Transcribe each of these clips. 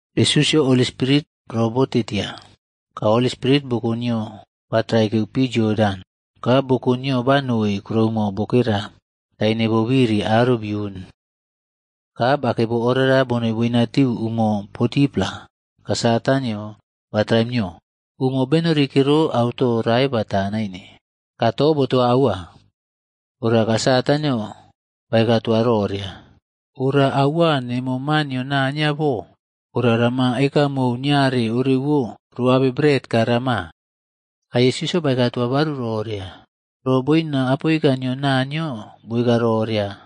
Yesusꞌyo Holi Spirit robote tia, ka Holi Spirit boko nio ba traikeu pi Yodan, ka boko nio banoi kuroumo bokera taine bobiri aro bouni. Ka bakei bo orara bonoi boinatiu umo 40-pla, ka Satanꞌyoa ba traim nio. Umo benori kero auto rae bata naine. Ka to botoa aua. Ora ka Satanꞌyo baeka toa roria, “Ora aua nemo Maa nio Naniyo bo, ora rama ekamou niare orewo ro abe bret ka rama.” Ka Yesusꞌyo baeka toa baru roria, “Ro boina apoika nio Naniyo boeka roria,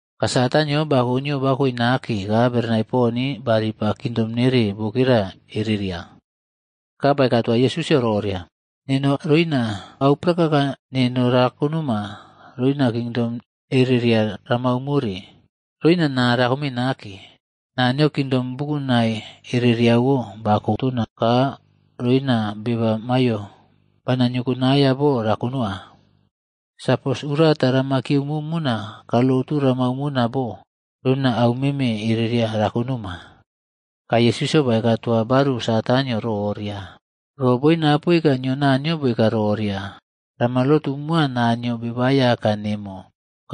Ka Satanꞌyo bako nio bakoe nake ka berenai pon baripa kingdom nere bokera erera. Ka baeka toa Yesusꞌyo roria, “Neno roina au prakaka neno rakonoma roina kingdom ereria ramau more, roina naa rakome nake. Naniyo Kingdom bukunai ereriawo bako tona ka roina beba maiyo bana niokonana bo rakonowa. Sapos urata rama kiyeumo mona ka lotu ramau mona bo, roina au meme ereria rakonoma.” Ka Yesusꞌyo baeka toa baru Satan roria, “Ro boina Apoika nio Naniyo boeka roria, ‘Rama lotu moa Naniyo Beba Aiyaka nemo,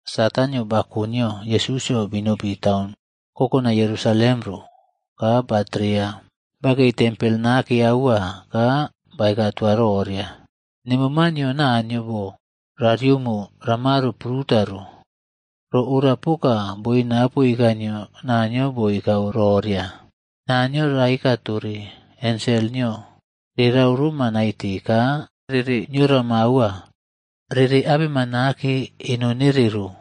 Satanꞌyo bako nio Yesusꞌyo binopi taun kokonai Yerusalem ro ka batreya bakei tempel nake aua, ka baeka toa roria, “Nemo maa nio Naniyo bo, ra riomo ramaro pruta ro. Ro ora poka boina apoika nio Naniyo boeka roria, ‘Naniyo raeka tore ensel nio rerau roma naite ka rere niorama aua. Rere abema nake eno nere ro,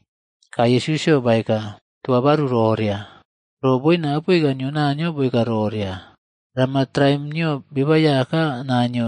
Ka Yesusꞌyo baeka toa baru roria, “Ro boina apoika nio Naniyo boeka roria, ‘Rama traim nio Beba Aiyaka,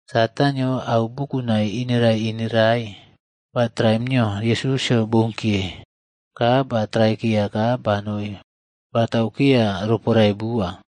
Satanꞌyo au bukunai ineraiꞌinerai ba traim nio Yesusꞌyo bounkiye, ka ba traikeya ka banoi bataukeya roporae bua.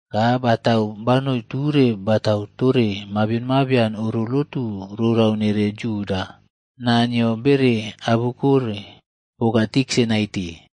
Ka batau banoi ture batau tore mabion mabian oro lotu rorau nere Yuda.f Naa nio bere abukore poka tiksa naite.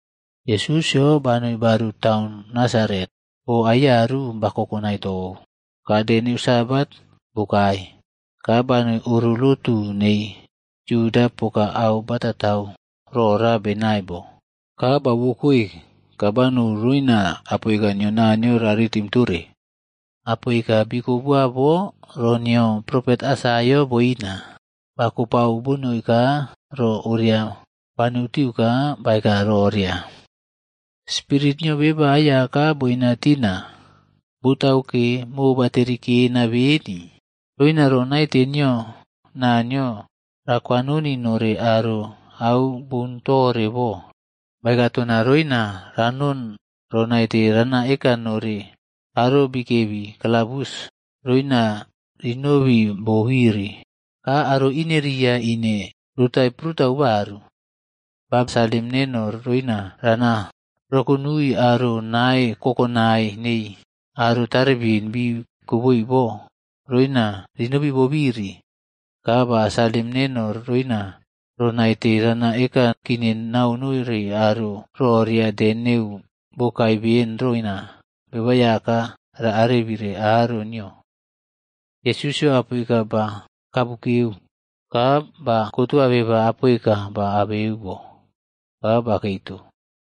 Yesusꞌyo banoi baru taun Nasaret, bo Aiyaru ba kokonai tou. Ka de neu Sabatg bokae, ka banoi oro lotuh nei Yuda poka au batatau rora benai bo. Ka bauwokoe ka banou roina apoika nio Naniyo ra ritim tore. Apoika bikoboa bo ro nio propet Aisaiaꞌo boina. Ba kopao bonoi ka ro oria banoutiu ka baeka roria. “Spirit nio Beba Aiyaka boina tina, botauke, mobaterikena beni roina ro naite nio Naniyo rakwanoni nore aro au boun tore bo. Baeka tona roina ranon ro naite rana eka noi aro bikebi kalabus roina rinobi bobiri, ka aro ineriya ine rotai prutau baru. Ba salim neno roina rana rokonuii aro nae kokonai nei aro tarebin bii koboi bo roina rinobi bobiri. Ka ba salim neno roina ro naite rana ekaꞌkine nau nore aro roria de neu bokae beni roina Beba Aiyaka ra arebii aro nio.”i Yesusꞌyo apoika ba kabukeu ka bakotoa beba apoika ba abu bo, ka bakei to.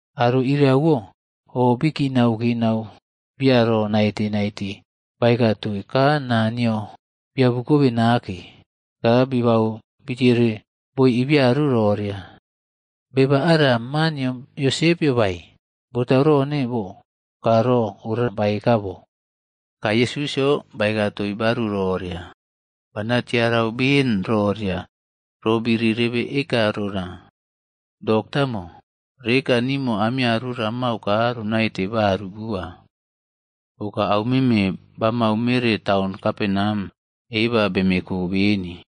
Aro iriawo o bii kinauꞌkinau biya ro naite naite baeka toii ka naa nio biabukobe nake. Ka bibau bitiere boi ibiaru roria, “Beba ara ma nio Yosepꞌyo bae? Botau rone bo ka ro ora baeka bo?” Ka Yesusꞌyo baeka toii baru roria, “Bana tiarau ben roria roꞌbiri rebe eka rona. ‘Doktaꞌmo, reka nimo amiaru ramau ka ronaite baru bua. Poka au meme bamau mere taun Kaperneam eba bemeko beni,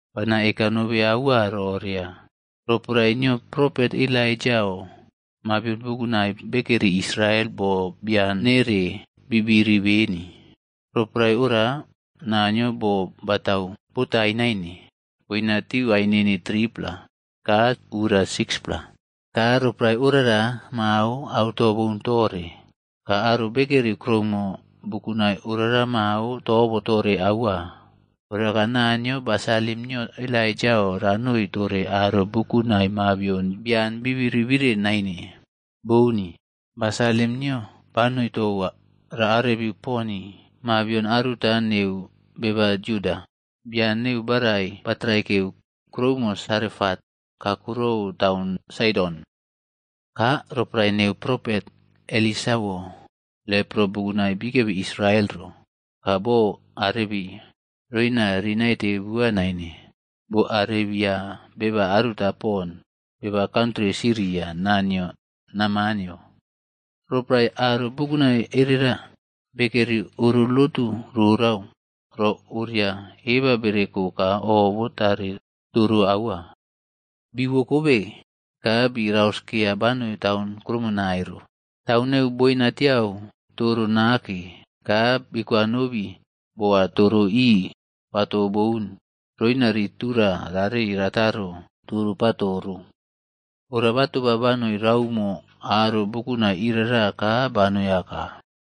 Bana eka aua nobe roria, roporae nio propet Elaijaꞌo mabion bukunai bekeri Israel bo bian nere bibiri beni. Roporae oria, Naniyo boo batau botaii naine boinatiu ainini 3-pla ka ura 6-pla. Ka roporae orara mao auto boun tore ka aro bekeri kuroumo bukunai orara mao tobotore aua. Ora ka Naniyo ba salim nio Elaijaꞌo ranoi tore aro bukunai mabion bian bibiri bire naine. Bouni. Ba salim nio banoi tou raꞌarebiu poni mabion aruta neu beba Yuda, bian neu barai batraikeu kuroumo Sarefat kakurou taun Saidon. Ka roporae neu propet Elisaꞌwo, lepro bukunai bikebi Israel ro, ka bo arebii roina rii naite bua nain. Bo arebia beba aruta pon, beba kantri Siria naa nio Namanꞌyo.” Roporae aro bukunai ereria bekeri oro lotu rorau, ro oria eba bereko ka o botare toro aua. Biwokobe ka bii rauskeya banoi taun kurumonae ro. Taun nei boinatiau toro nake, ka biiꞌkowanobi boa toro ii patoꞌboun roina rii tura rarei rataro toro pato ro. Ora batoba banoi raumo aro buknai irara ka banoi aka.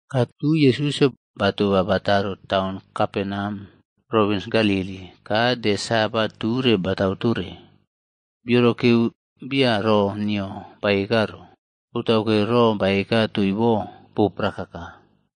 Ka tui Yesusꞌyo batoba bataro taun Kaperneam provins Galili, ka de Sabat ture batau tore. Biorokeu bia ro nio baeka ro, botauke ro baeka toii bo, bo prakaka.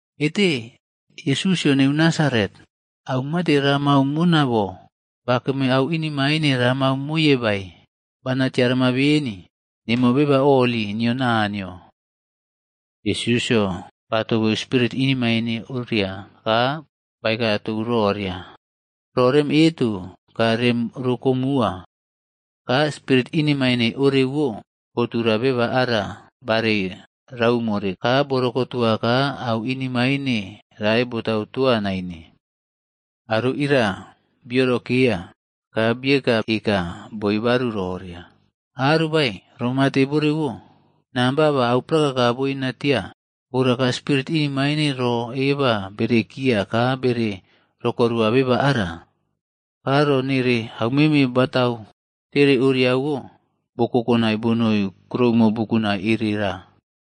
“Ete? Yesusꞌyo neu Nasaret, au mate ramau moma bo? Bakame au inemaine ramau moye bae? Bana tiarama beni, nemo Beba Holi nio Naniyo.” Yesusꞌyo batobeu spirit inemaine oria ka baeka tou roria, “Ro rem eto ka rem rokomuwa.” Ka spirit inemaine orewo botura beba ara barei raumore ka boꞌrokotua ka au inemaine rae botau toa naine. Aro iria biorokeya ka biekaꞌeka boi baru roria, “Arobae, ro mate borewo? Namba ba au prakaka boina tia, ora ka spirit inemaine ro eba berekiya ka bere rokorua beba ara.” Ka ro nere aumeme batau tere oriawo, bo kokonai bonoi kuroumo bukunai erera.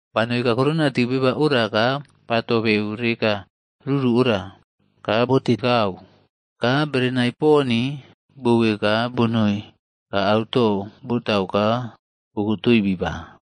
Banou kakurona tiu beba ora ka ba tobeu reka ruru ora, ka botekau. Ka berenai poni bowokoe ka bonoi ka auto botau ka bokotoi biba.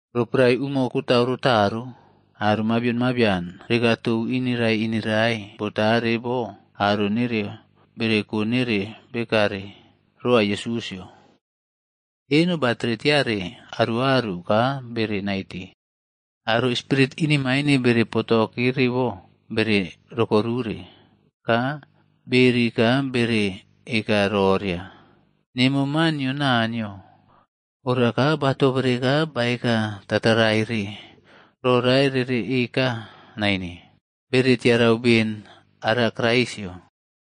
Roporae umo katau rataro, aro mabion mabian rekaꞌtou ineraiꞌinerai botare bo aro nereo bere ko nere bekare roa Yesusꞌyo. Eno batere tiare aruꞌaru ka bere naite. Aro spirit inemaine bere potokere bo bere rokorure, ka beeri ka bere eka roria, “Nemo Maa nio Naniyo.” Ora ka batobere ka baeka tataraire ro rae rereꞌeka naine. Bere tiarau beni ara Kraisꞌyo.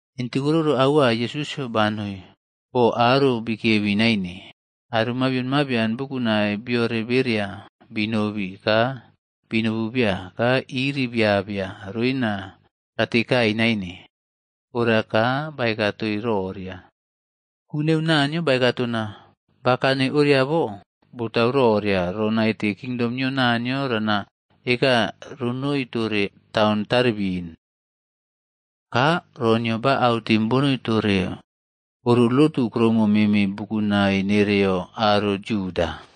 Intikiꞌroro aua Yesusꞌyo banoi bo aro bikebi naine. Aro mabion mabian bukunai biore bereya binobi ka binobu biya ka iriꞌbiabia roina ratekai naine. Ora ka baeka toii roria, “Ku neu Naniyo baeka tona bakane oria bo, botau roria ro naite kingdom nio Naniyo rana eka ronoi tore taun taribin.” Ka ro nio ba autim bonoi tore oro lotu kuroumo meme bukunai nereo aro Yuda.